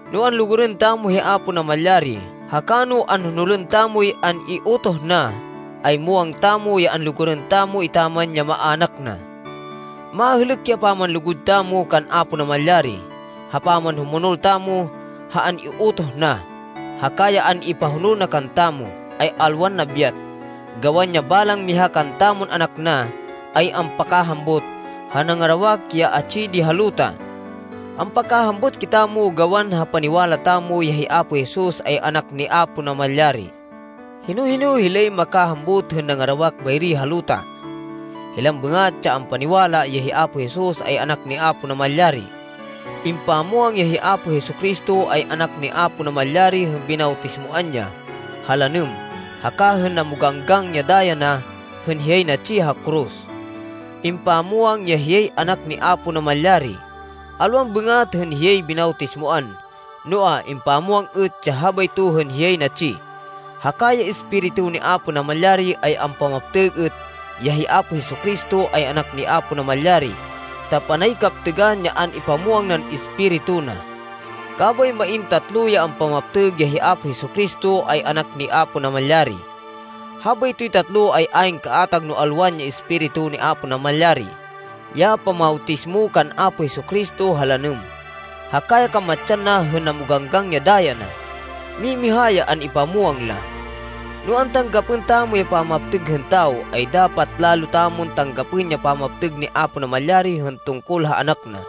No anlugurên tamo hi Apo Namalyari haka no anhonolên tamoy an-iutoh na, ay muwang tamo ya anlugurên tamo etaman ya maának na. Mahêlêk ya pamanlugud tamo kan Apo Namalyari, ha pamanhumonol tamo ha an-iutoh na. Haka ya an-ipahonol na kantamo, ay alwan nabyat, gawan ya balang miha kantamon anak na, ay ampakahambut ha nangarawak, ya atsi di ha luta. Ampakahambut kitamo gawan ha paniwala tamo, ya hi Apo Jesus ay Anak ni Apo Namalyari. Hino-hino hilay makahambut hên nangarawak bayri ha luta? Hilan bêngat ya ampaniwala, ya hi Apo Jesus, ay Anak ni Apo Namalyari. Impamwang ya hi Apo Jesu-Cristo ay Anak ni Apo Namalyari hên binawtismoan ya ha lanêm, haka hên namoganggang ya daya na hên hiyay natsi ha koros. Impamwang ya hiyay Anak ni Apo Namalyari, alwan bêngat hên hiyay binawtismoan, noa, impamwang êt ya habayto hên hiyay natsi. Haka ya Espiritu ni Apo Namalyari ay ampamaptêg êt ya hi Apo Jesu-Cristo ay Anak ni Apo Namalyari, ta panay kaptêgan ya an-ipamwang nan Espiritu na. Kabay main tatlo ya ampamaptêg ya hi Apo Jesu-Cristo ay Anak ni Apo Namalyari. Habaytoy tatlo ay ayn kaatag no alwan ya Espiritu ni Apo Namalyari, ya pamawtismo kan Apo Jesu-Cristo ha lanêm, haka ya kamatsan na hên namoganggang ya daya na. Mimiha ya an-ipamwang la. No antanggapên tamo ya pamaptêg hên tawo, ay dapat lalo tamon tanggapên ya pamaptêg ni Apo Namalyari hên tungkol ha Anak na,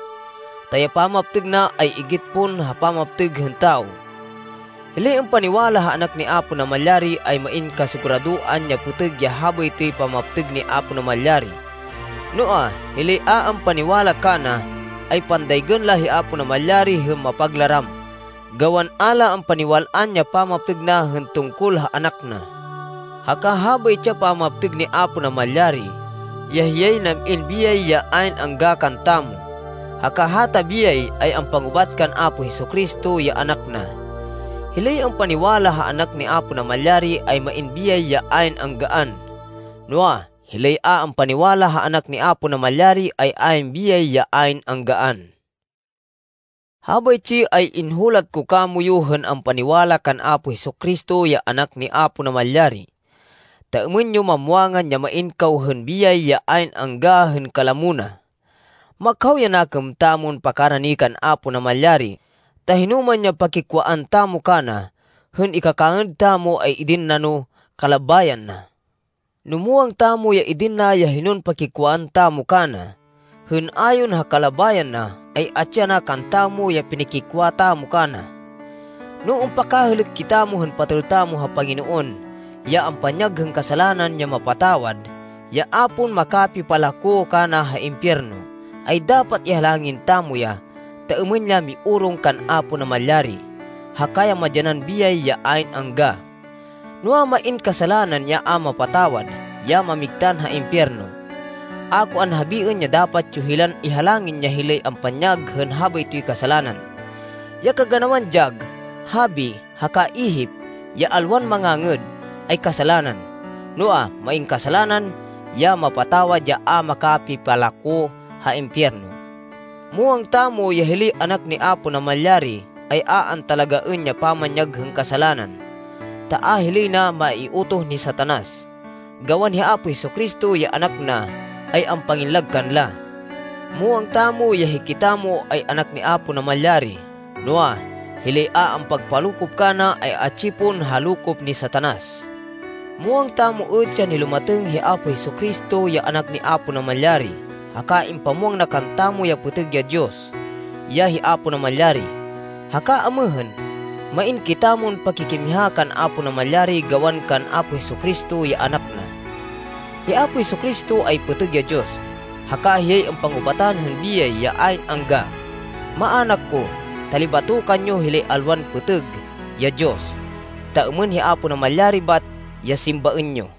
ta ya pamaptêg na ay igit pon ha pamaptêg hên tawo. Hilay ampaniwala ha Anak ni Apo Namalyari, ay main kasiguradoan ya pêtêg ya habaytoy pamaptêg ni Apo Namalyari. Noa, hilay a ampaniwala kana, ay pandaygên la hi Apo Namalyari hên mapaglaram, gawan a la ampaniwal-an ya pamaptêg na hên tungkol ha Anak na. Haka habaytsi ya pamaptêg ni Apo Namalyari, ya hiyay nam-in biyay ya ayn angga kantamo, haka hata biyay, ay ampangubat kan Apo Jesu-Cristo, ya Anak na. Hilay ampaniwala ha Anak ni Apo Namalyari, ay main biyay ya ayn anggaan, noa, hilay a ampaniwala ha Anak ni Apo Namalyari ay ayn biyay ya ayn anggaan. Habaytsi ay inhulat ko kamoyu hên ampaniwala kan Apo Jesu-Cristo ya Anak ni Apo Namalyari, ta êmên yo mamwangan, ya main kaw hên biyay ya ayn angga hên kalamo na. Makhaw ya nakêm tamon pakarani kan Apo Namalyari, ta hinoman ya pakikwaan tamo kana hên ikakangêd tamo, ay idin na no kalabayan na. No muwang tamo ya idin na ya hinon pakikwaan tamo kana, hên ayon ha kalabayan na, ay atsi yana kantamo ya pinikikwa tamo kana. No ampakahêlêk kitamo hên patêl tamo ha Panginoon ya ampanyag hên kasalanan ya mapatawad, ya a pon makapipalako kana ha impiyerno, ay dapat ihalangin tamo ya ta êmên ya miorong kan Apo Namalyari haka ya madyanan biyay ya ayn angga. Noa, main kasalanan ya a mapatawad, ya mamigtan ha impiyerno. A ko anhabiên ya dapat yo hilan ihalangin ya hilay ampanyag hên habaytoy kasalanan. Ya kaganawan dyag, habi, haka ihip ya alwan mangangêd, ay kasalanan. Noa, main kasalanan ya mapatawad ya a makapipalako ha impiyerno. Muwang tamo, ya hilay anak ni Apo Namalyari ay a antalagaên ya pamanyag hên kasalanan, ta a hilay na maiutoh ni Satanas, gawan hi Apo Jesu-Cristo, ya Anak na, ay ampangillag kanla. Muwang tamo ya hikitamo ay anak ni Apo Namalyari, noa, hilay a ampagpalokop kana, ay atsi pon ha lokop ni Satanas. Muwang tamo êt ya nilumatêng hi Apo Jesu-Cristo, ya Anak ni Apo Namalyari, haka impamwang na kantamo ya pêtêg ya Diyos ya hi Apo Namalyari. Haka amêhên, main kitamon pakikimiha kan Apo Namalyari gawan kan Apo Jesu-Cristo, ya Anak na. Hi Apo Jesu-Cristo ay pêtêg ya Diyos, haka hiyay ampangubatan hên biyay ya ayn angga. Maának ko, talibatokan yo hilay alwan pêtêg ya diyos, ta êmên hi Apo Namalyari bat ya simbaên yo.